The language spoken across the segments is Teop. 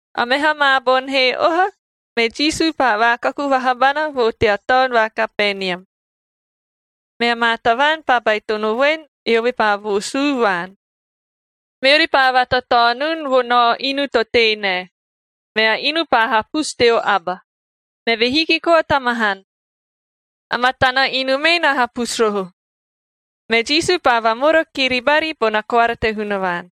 A meha maa boni he oha, me Jisu paa vaakaku vaha bana vo tea taon va Kapenium. Mea maa tavaan paa baitono voen, eove paa voosuu vaan. Meori paa vatataonun vo nao inu to tei nae, mea inu paa hapusu teo aba, meve hiki koa ta mahan. A matana inu mee na hapusu roho. Me Jisu paa vamora kiri bari bona koara te Hunavaan.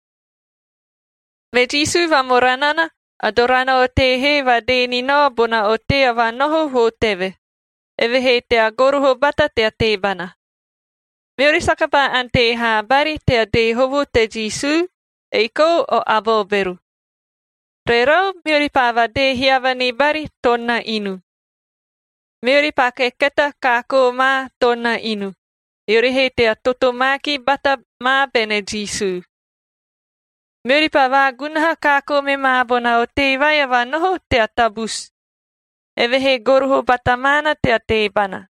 Me Jisu vamora nana, a dorana a otei he vadee ni nao bona otei a vanoho vo teve, eve he tea goroho bata tea teebana. Meori saka paa ante haa bari tea dee hovo te Jisu, ei kou o aba o bero. Rerau, meori paa vadee hiava ni bari toon na inu. Meori paa keketaa kaakoo ma toon na inu, eori he tea totomaakib bata ma bene Jisu. Meori paa vaagunaha kaakoo me ma bona otei vai a vanoho tea tabusu, eve he goroho bata maana tea teebana.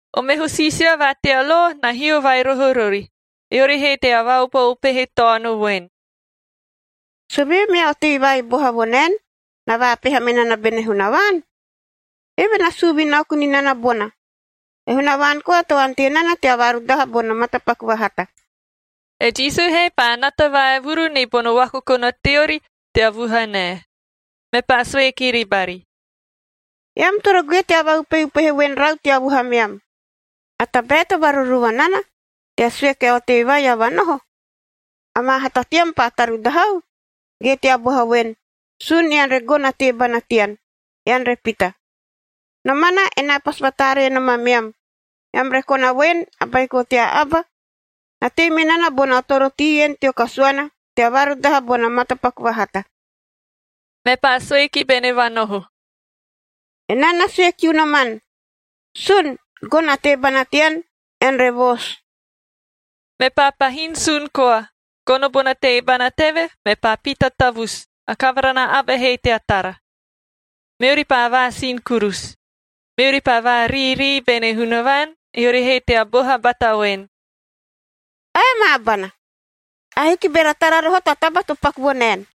O meho siisia va tea lo na hio vai roho rori, eori he tea vaupeupehe taono voen, “Sovee mea otei vai boha vo naen, na vaapeha me nana bene Hunavaan? Eve na suu vinaoku ni nana bona. E Hunavaan koa to ante nana tea vaarudaha bono matapaku vahata.” E Jisu he paa nata vaevuru ni bono vakokona teori tea vuhanae. Mepaa sue kiri bari, “Eam toro goe tea vaupeupehe voen rau tea vuhameam. A tabae to varuruva nana, tea sue kia otei vai a vanoho, ‘Amaa hata tean paa tarudahau’ ge tea boha voen, ‘Sun ean re gono a teebana tean, ean re pita’? Nomana enaa pasi vataaree nom ameam, eam re kona voen, a Baiko tea Abacd na tei me nana bono atorotii en teo kasuana tea vaarudaha bono matapaku vahata.” Mepaa sue ki bene vanoho, “Enaa na sue kiu noman, sun, gono a teebana tean, ean re voosu.” Mepaa pahin sun koa, gono bona teebana teve, mepaa pita tavusu, a kavara na aba he tea tara. Meori paa vaasin kurusu, meori paa variirii bene Hunavaan, eori he tea boha bata voen, “Ae maa bana! Ahiki beara tara roho ta taba to paku vo naen!”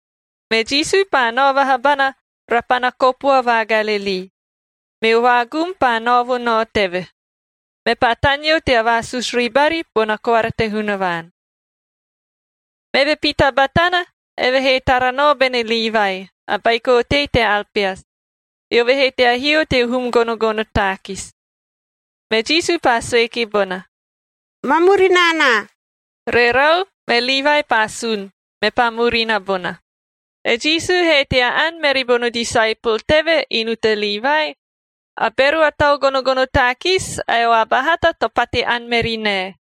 Me Jisu paa nao vaha bana rapana kopua va Galilii, meo vaagum paa nao vo nao teve, mepaa taneo tea vaasusu ribari bona koara te Hunavaan. Meve pita batana, eve he tara nao bene Livai, a baiko otei te Alpeas, eove he tea hio teo hum gonogono taakis. Me Jisu paa sue ki bona, “Ma murina anaa.” Rerau, me Livai paa sun, mepaa murina bona. E Jisu he tea ani meri bono disaepol teve inu te Livai, a bero a tau gonogono taakis ae o aba hata to pate ani meri nae,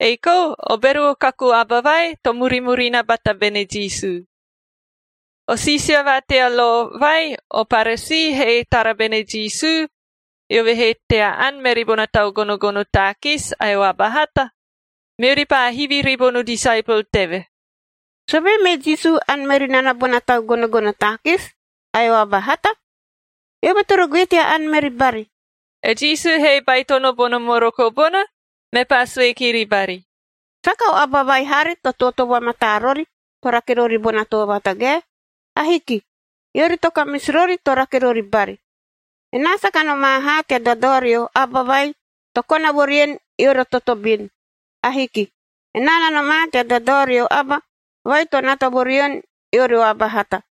ei kou o bero o kaku aba vai to murimurina bata bene Jisu. O siisia va tea lo vai o Paresiie he tara bene Jisu, eove he tea ani meri bona tau gonogono taakis ae o aba hata, meori paa hivi ribono disaepol teve, “Sovee me Jisu ani meri nana bona tau gonogono taakis ae o aba hata? Eove toro goe tea ani meri bari.” E Jisu he baitono bono moroko bona, mepaa sue kiri bari, “Saka o aba vai haari to tootoo vamataa rori to rake rori bona too vatagae. Ahiki. Eori to kamisi rori to rake rori bari.f Enaa saka nomaa haa tea dadao rio aba vai to kona vo rien, eori o totobin. Ahiki. Enaa na nomaa tea dadao rio aba vai to nata vo rien, eori o aba hata.”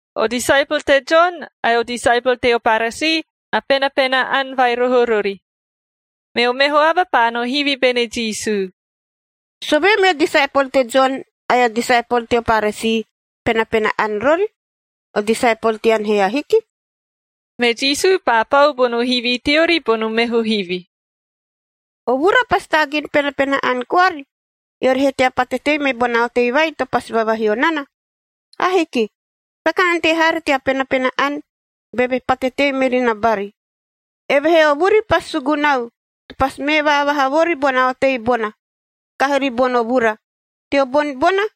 O disaepol te Jon ae o disaepol teo Paresii na penapena ani vai roho rori, meo meho aba paa no hivi bene Jisu, “Sovee meo disaepol te Jon ae o disaepol teo Paresii penapena ani rori, o disaepol tean he ahiki?” Me Jisu paa pau bono hivi teori bono meho hivi, “O vura pasi taagin penapena ani koari eori he tea pate tei me bona otei vai to pasi vavahio nana? Ahiki, saka ante haari tea penapena ani beve pate tei meri na bari. Evehee o vuri pasi sugunau to pasi mee vaavaha vori bona otei bona, kahi ribono vura. Teo boni bona,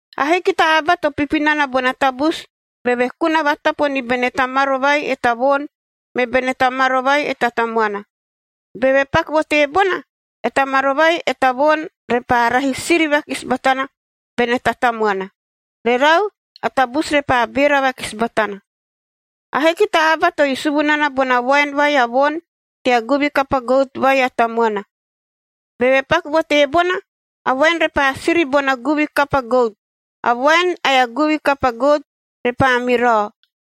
“Ahiki ta aba to pipi nana bona tabusu beve kuna vatapo ni bene ta maro vai e ta voon me bene ta maro vai e ta tamuana. Beve paku vo teebona, e ta maro vai e ta voon repaa rahi siri vakisi batana bene ta tamuana. Rerau, a tabusu repaa beera vakisi batana. “Ahiki ta aba to isuvu nana bona voaen vai a voon tea guvi kapa gout vai a tamuana. Beve paku vo teebona, a voaen repaa siri bona guvi kapa gout. A voaen ae a guvi kapa gout repaa mirao.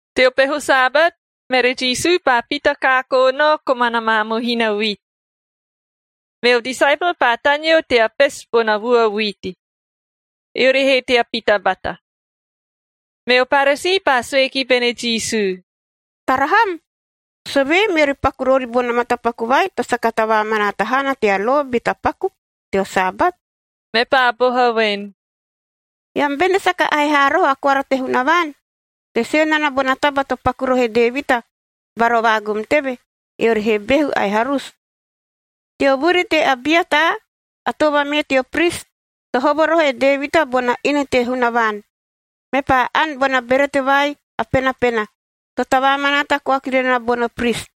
Teo peho Sabat, mere Jisu paa pita kaakoo nao komana maa mohina vuiti. Meo disaepol paa taneo tea pesu bona vua vuiti, eori he tea pita bata. Meo Paresii paa sue ki bene Jisu, “Tara ham! Sovee meori paku rori bono matapaku vai to saka tavaamanaata haana tea lo be tapaku teo Sabat?” Mepaa boha voen, “Eam bene saka ahe haa roho a koara te Hunavaan to sue nana bona taba to paku roho e Devita bara o vaagum teve, eori he behu ae harusu? Teo vuri te Abiata, a too vamee teo pris, to hovo roho e Devita bona inu te Hunavaan, mepaa ani bona berete vai a penapena, to tavaamanaata koa kiri na bono pris.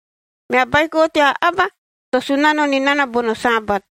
Mea Baiko tea Aba to Sunano ni nana bono Sabat.”